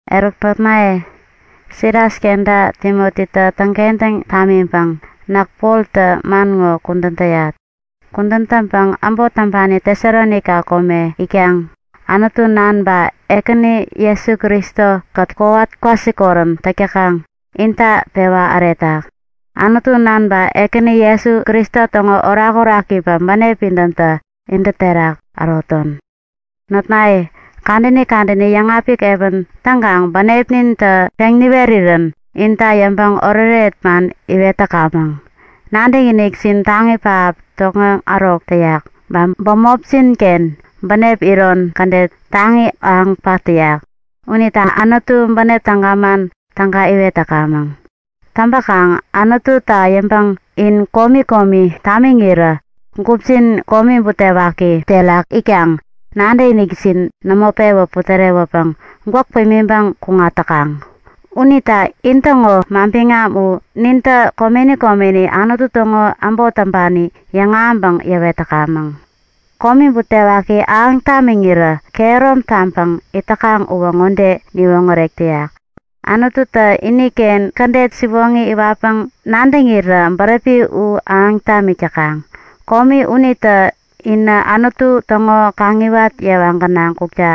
Eruk notnaye, Silas kenta Timotitä täŋkentäŋ namänpäŋ näk Poltä man ŋo kudän täyat. Kudän täŋpäŋ äbot täŋpani Tesalonaika kome itkaŋ, Anutu Nan ba Ekäni Jesu Kristo-kät kowat kwasikorän täk täkaŋ, inta pewa äretak. Anutu Nan ba Ekäni Jesu Kristo täŋo orakoraki ba bänep pidämtä intä terak äroton. Notnaye, kadäni kadäni yäŋapik epän täŋkaŋ bänepnintä peŋ niwerirän inta yäŋpäŋ oretoret man iwet täkamäŋ. Nadäkinikjin taŋi pähap tokŋeŋ ärok täyak, ba bämopjin-ken bänep iron kädet taŋi ahäŋ pat täyak, unita Anutu bänep täga man täga iwet täkamäŋ. Täŋpäkaŋ Anututa yäŋpäŋ in komi komi tamiŋirä gupjin komi butewaki terak itkaŋ nadäkinikjin nämo pewä putärewäpäŋ gwäk pimiŋpäŋ kuŋat täkaŋ. Unita intäŋo manbiŋam u nintä komeni komeni Anutu täŋo äbot täŋpani yäŋahäŋpäŋ yäwet täkamäŋ. Komi butewaki ahäŋ tamiŋirä kehärom taŋpäŋ it täkaŋ uwä ŋode niwoŋärek täyak; Anututä iniken kädet siwoŋi iwatpäŋ nadäŋirän bäräpi u ahäŋ tamik täkaŋ. Komi unitä inä Anutu täŋo kaŋiwat yewa gänaŋ kukta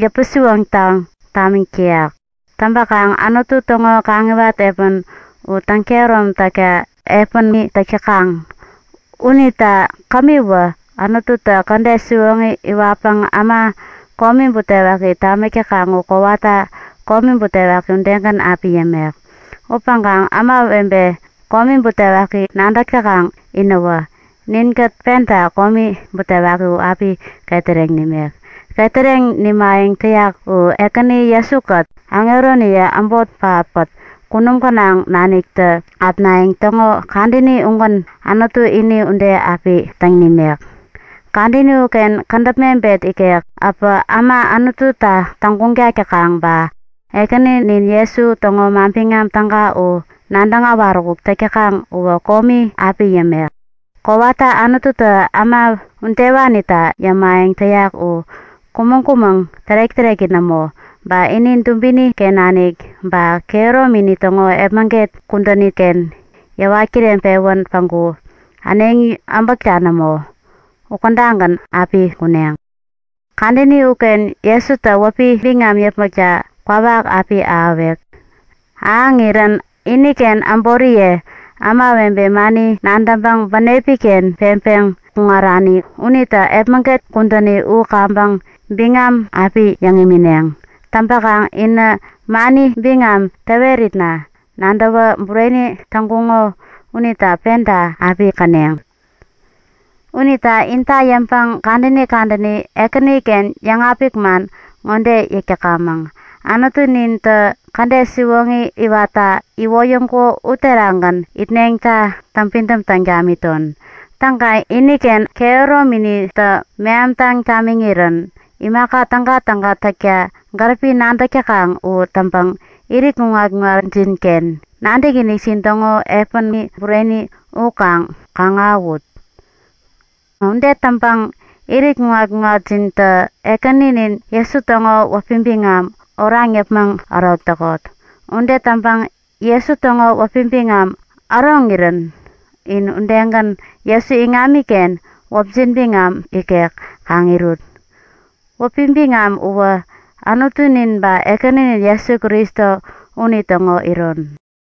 yäpän-siwoŋtaŋ tamik täyak. Täŋpäkaŋ Anutu täŋo kaŋiwat epän u täŋkehärom takta epäni täk täkaŋ. Unita kämiwä Anututä kädet siwoŋi iwatpäŋ äma komi butewaki tamik täkaŋ u kowata komi butewaki udegän api yämek. Upäŋkaŋ ämawebe komi butewaki nadäk täkaŋ inäwä, ninkät penta komi butewaki u api ketäreŋ nimek. Ketäreŋ nimayäŋ täyak u Ekäni Jesu-kät aŋeroniye äbot pähap-kät kunum gänaŋ naniktä äpnayäŋ täŋo kadäni ugän Anutu ini ude api täŋ nimek. Kadäni uken kädäp mebet ikek äpä äma Anututa täŋguŋtak täkaŋ ba Ekäninin Jesu täŋo Manbiŋam Täga u nadäŋ äwaräkuk täk täkaŋ uwä komi api yämek. Kowata Anututä äma udewanita yämayäŋ täyak u kumäŋ-kumäŋ tärek-täreki nämo. Ba ini dubini-ken nanik ba kehäromini täŋo epmäget kudäniken yäwat kireŋpewän päŋku äneŋi äbäkta nämo, ukädagän api kuneŋ. Kadäni uken Jesutä wäpi biŋam yäpmäkta kwawak api ahäwek. Ahäŋirän iniken äboriye, ämawebe mani nadäŋpäŋ bänepi-ken peŋpeŋ kuŋarani unitä epmäget kudäni u kaŋpäŋ biŋam api yäŋ imineŋ. Täŋpäkaŋ inä mani biŋam täweritna nadäwä bureni täŋkuŋo unita penta api käneŋ. Unita inta yäŋpäŋ kadäni kadäni Ekäniken yäŋapik man ŋode yäk täkamäŋ; Anutunintä kädet siwoŋi iwatta iwoyäŋkuko uterakgän itneŋta täŋpidäm taŋ tamiton. Täŋkaŋ iniken kehärominitä mehamtäŋ tamiŋirän imaka tägatäga täkta gäripi nadäk täkaŋ u täŋpäŋ irit kuŋat-kuŋatjinken nadäkinikjin täŋo epäni bureni u kaŋ kaŋ-ahäwut. Ude täŋpäŋ irit kuŋat-kuŋatjintä Ekäninin Jesu täŋo wäpi biŋam oraŋ yäpmäŋ ärok täkot. Ude täŋpäŋ Jesu täŋo wäpi biŋam äroŋirän in udegän Jesu iŋamiken wäpjin biŋam ikek kaŋ irut. Wäpi biŋam uwä Anutunin ba Ekäninin Jesu Kristo unitäŋo iron.